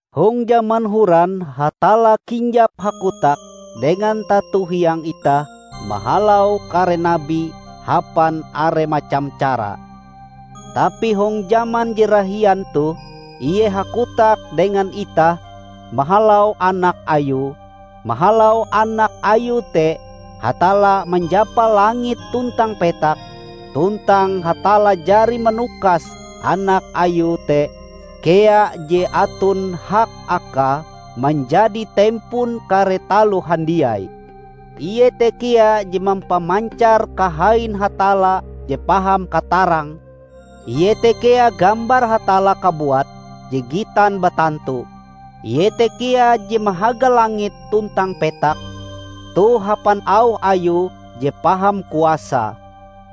Hong jaman horan Hatalla kinjap hakotak dengan tato hiang itah mahalau kare nabi hapan are macam cara. Tapi hong jaman je rahian toh Ie hakotak dengan itah mahalau Anak Ayue. Mahalau Anak Ayue te Hatalla manjapa langit tuntang petak. Tuntang Hatalla jari manukas Anak Ayue te kea je aton hak Akae manjadi tempon kare taloh handiai. Ie te kea je mampamancar kahain Hatalla je paham katarange; Ie te kea gambar Hatalla kabuat je gitan batantu. Ie te kea je mahaga langit tuntang petak toh hapan auh Ayue je paham kuasae.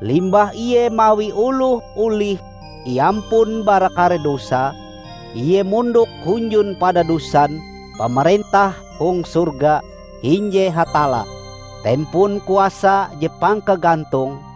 Limbah Ie mawi oloh olih iampun bara kare dosae, Ie mondok hunjun padadosan pamarentah hong sorga hinje Hatalla, Tempon kuasa je pangkagantonge.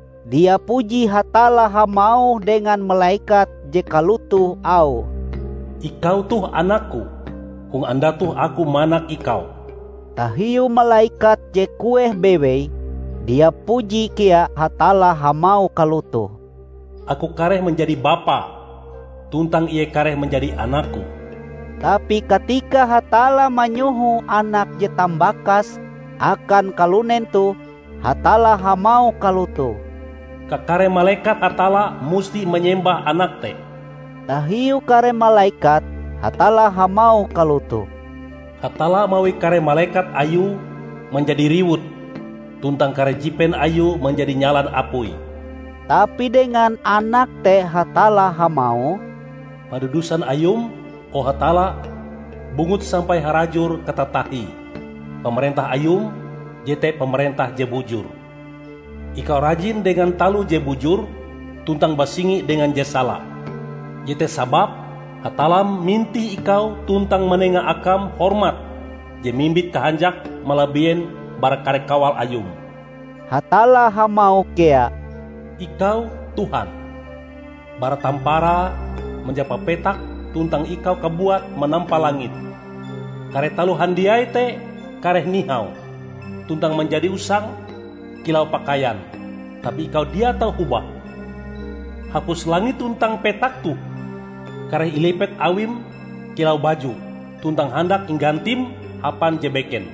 Dia puji Hatalla hamauh dengan malekat je kalotoh auhe, "Ikau toh Anakku; hong andau toh Aku manak Ikau." Tahiu malekat je kueh bewei, dia puji kea Hatalla hamauh kalotoh, "Aku kareh manjadi Bapae, tuntang Ie kareh manjadi Anak-Ku." Tapi katika Hatalla manyoho Anake je tambakase akan kalunen toh, Hatalla hamauh kalotoh, "Kakare malekat Hatalla musti manyembah Anak te." Tahiu kare malekat, Hatalla hamauh kalotoh, "Hatalla mawi kare malekat Ayue manjadi riwut, tuntang kare jipen Ayue manjadi nyalan apui." Tapi dengan Anak te Hatalla hamauh, "Padadusan Ayum, o Hatalla, bunggut sampai harajur katatahie! Pamarentah Ayum jete pamarentah je bujur. Ikau rajin dengan taloh je bujur tuntang basingi dengan je sala; jete sababe, Hatallam, mintih Ikau tuntang manenga Akam hormat je mimbit kahanjak, malabienbara kare kawal Ayum." Hatalla hamauh kea, "Ikau, Tuhan, bara tamparae manjapa petak, tuntang Ikau kabuat manampa langit. Kare taloh handiai te kareh nihau, tuntang manjadi usang kilau pakaian; tapi Ikau dia tau hobah. Hapus langit tuntang petak toh kareh ilipet awim kilau baju, tuntang handak inggantim hapan je beken.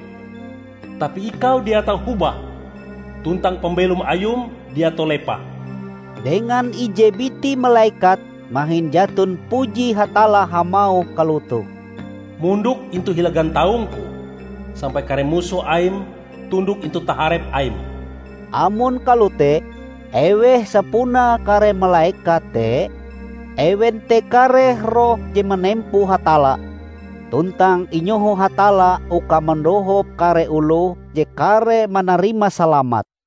Tapi Ikau dia tau hobah, tuntang pambelom Ayum dia tau lepah." Dengan ije biti malekat mahin jaton puji Hatalla hamauh kalotoh, "Mondok intu hila gantaung-Ku, sampai kare musoh Aim tundok intu taharep Aim." Amon kalote, eweh sapunae kare malekat te? Ewen te kare roh je manempo Hatalla, tuntang inyoho Hatalla uka mandohop kare oloh je kareh manarima salamat.